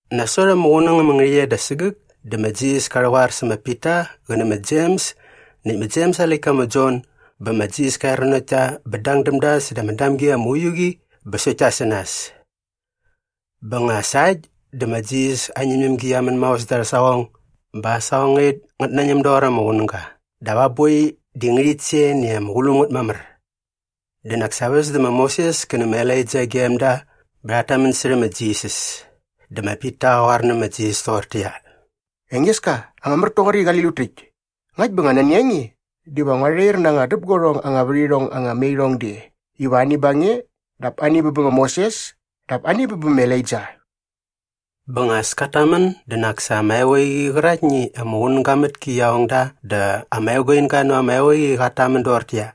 Nasot ama qunäng ama ngärhäqyet da sägäk dä ma Jisas ka rhäqoar sä ma Pita qä nä ma Jems näkt ma Jems aa läktka ma Jon bä ma Jisas ka er nanokt ta bä dang däm da säda ama damgi ama uiu qi bä sokt ta sä nas. Bä nga sa äkt dä ma Jisas aa ñämñämgi qia män maos da arhä saqong bä aa saqongait ngät nañäm doqor ama qunäga dap aa boi di ngärhit sen i ama qulum ngät mamär. Dä nak sa väs dä ma Moses kä nä ma Elaija gem da bä rhat tamän särhä ma Jisas. Dä Pita qa qoar nä ma Jisas toqortäqyia, “Engeska, ama mär toqoräkt i qali lut täkt. Ngakt bä nani a nge diva ngua rhair na anga däpguarhong anga värhirhong anga me irhong de iva ani ba nge dap ani bä bä ma Moses dap ani bä bä ma Elaija.” Bä nga as kat tamän dä nak sa ama eqoeqi qäraktni i ama qunäga mät ki qia ong da dä ama eguinga näva ama eqoeqi qat tamän doqortäqyia,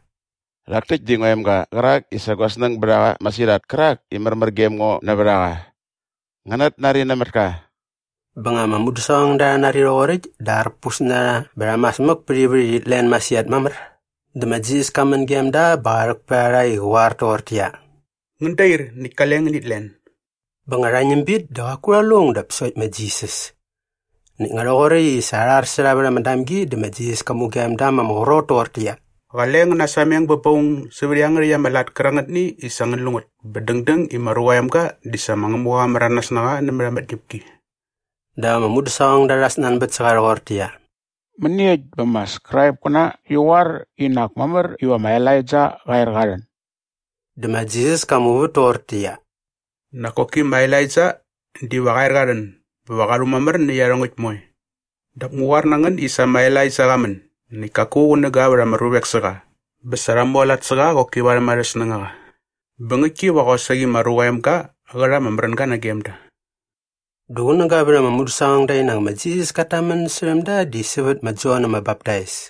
“Rhak täkt di ngua emga qärak i sa gua snäng bät a qa masirhat kärak i märmär gem ngo nävät a qa. Ngänät nari nämät ka.” Bä nga ama mudäsaqongda rha nari rhoqoräkt dä arpus na rha bä rha mas mäk pät ivät i rhit len masirhat mamär. Dä ma Jisas ka män gem da bä qa rhäk pät a rha i qä qoar toqortäqyia, “Ngän dair näkt kale ngänit len.” Bä nga rha ñäm bit dä qaku rha lu aung dap sokt ma Jisas. Näkt nga rhoqoräkt i arhar sä rha vät ama damgi dä ma Jisas ka mugem da ma ama qrot toqortäqyia, “Qale ngän nasameng bä ba aung sävät iangärhäkt ama lat kärangät i sa ngän lu ngät bä dängdäng i ma Ruqa aa Emga di sa ma Ngämuqa qa märanas na qa nämät ama tñäpki.” Dä ama mudäsaqongda rha snanbät sä qa rhoqortäqyia, “Mäniekt bä ama Skraipkäna rhi qoar i nak mamär iva ma Elaija qa er qa rhän?” Dä ma Jisas ka muvät toqortäqyia, “Nak koki ma Elaija diva qa er qa rhän bä va qa rhumamär nä iarhongäkt moe. Dap ngu qoar na ngän i sa ma Elaija qa män näkt kaku qunäga vät ama ruvek sä qa bä sa rha mualat sä qa qoki varhäm arhä snängaqa. Bä ngäktki va qosaqi ma Ruqa aa Emga qä rha ama märänga nagem da.” Dä qunäga vät ama mudäsaqongda i nak ma Jisas kat tamän särhäm da di sävät ma Jon ama Baptais.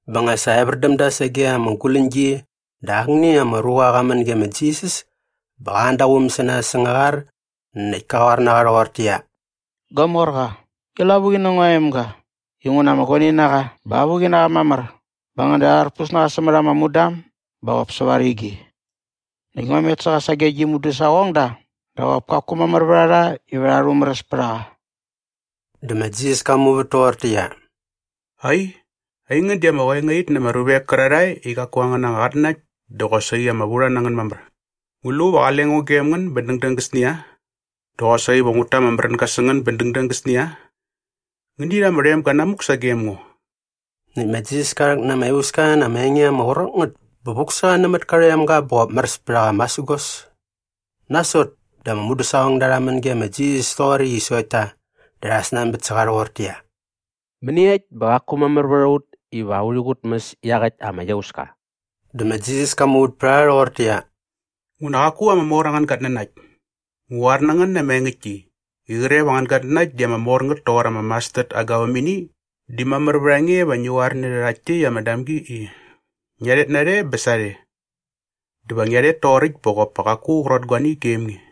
Bä nga sa evär däm da sage ama guläñgi dä akni ama ruqa qa män ge ma Jisas bä qa an da aa quum sä nas säng aa qar näkt ka qoar na qa rhoqortäqyia, “Gua morqa, ngi lavuqi nä ngua emga inguna ama guani na qa bä avuqi na qa mamär bä ngäda arharpus na qa sämät ama mudam bä qop säva rigi. Näkt ngua met sä qa sage gi mudäsaqongda dä qop kaku mamär vät a rha iva rha rhumäräs pät a qa.” Dä ma Jisas ka muvät toqortäqyia, “Ai, aingän di ama qoengait na ama ruvek kärarhae i qaku angän anga qatnanakt dä qosaqi ama vurha na ngän mamär. Ngu lu va qale ngo gem ngän bä dängdäng gäsnia? Dä qosaqi va ngut ta ama märänga sä ngän bä dängdäng gäsnia? Ngäni rha ama rhoemga namuk sagem ngo!” Näkt ma Jisas ka rhäk na ama iauska na ama enge ama qrot ngät bä vuk sä qa nämät ka rhoemga bä qop märäs pät a qa masägos. Nasot dä ama mudäsaqongda rha män ge ma Jisas toqoräkt i sokt ta dä rha snanbät sä qa rhoqortäqyia, “Mäniekt bä qaku mamär vät a ut iva urhi qutmäs iaqäkt ama iauska?” Dä ma Jisas ka muvät pät a rha rhoqortäqyia, “Nguna qaku ama mor angän gatnanakt. Ngu qoar na ngän na ama engäktki i qre va angän gatnanakt di ama mor ngät toqor ama mastard aa gavämini di mamär vät a nge iva ngi qoar nä rhärhakt täkt ama damgi i, ‘Ngia rhet narhe bä sarhe!’ Dä va qia rhet toqoräkt bä qop pa qaku a qrot guani gem nge.”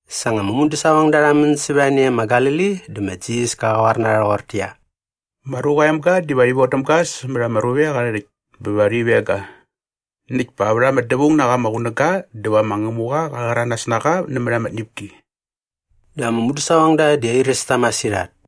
Sa nga ama mudäsaqongda rha män sävät a ne e ma Galili dä ma Jisas ka qoar na rha rhoqortäqyia, “Ma Ruqa aa Emga diva rhi vodäm ga sämät ama ruvek arhä rhäkt bä va rhi veng ga. Näkt pa vät ama dävaung na qa ama qunäga dä va ma Ngämuqa qa rhäranas na qa nämät ama tñäpki.” Dä ama mudäsaqongda di airäs ta masirhat.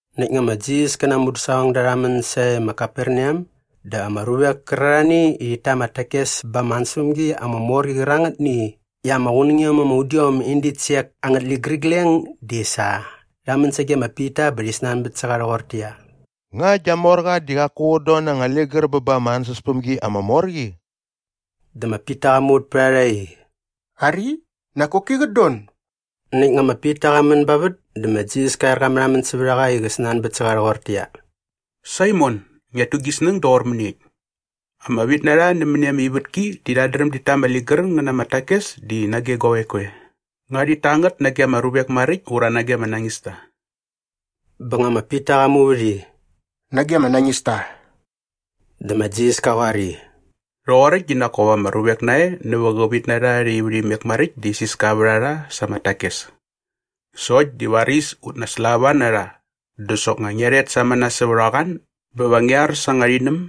Näkt nga ma Jisas kä na aa mudäsaqongda rha män sae ma Kaperneam dä ama ruvek kärarhani i rhit ta ama takes ba ama ansäspämgi ama mor qi qärangätni i ama qunängiom ama udiom in ditsek angät ligärigleng di sa rha män sage ma Pita bä rhi snanbät sä qa rhoqortäqyia, “Nga gia morqa di qaku qät don na anga ligär bä ba ama ansäspämgi ama mor qi?” Dä ma Pita qa muvät pät a rha i, “Ari, nak koki qät don.” Näkt nga ma Pita qa män ba vät dä ma Jisas ka er qa märhamän sävät a qa i qä snanbät sä qa rhoqortäqyia, “Saimon, ngiat tu gi snäng doqor mäniekt? Ama vitnarha nämäni ama ivätki di rhat dräm dit ta ama ligär ngä na ama takes di nage guavek koe? Nga rhit ta ngät nage arha ruvek maräkt ura nage ama nañista?” Bä nga ma Pita qa muvät i, “Nage ama nañista.” Dä ma Jisas ka qoar i, “Rhoqoräkt di nak kop ama ruvek nae nävä qä vitnarha arha ivärhimek maräkt di isiska vät a rha sa ama takes. Sokt di varis ut naslava na rha dä soknga ngia rhet samana sävät a qoan bä va ngi ar sa anga rhinäm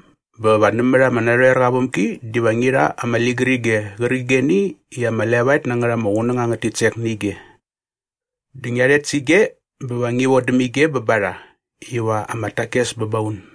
bä va nämät ama narhoerqa aa vämgi diva ngi rha ama ligärige qärqigeni i ama levaet na ngät ama qunäng angät titsek nä ige. Dä ngia rhet sä ige bä va ngi vodäm ige bä ba rha iva ama takes bä ba un.”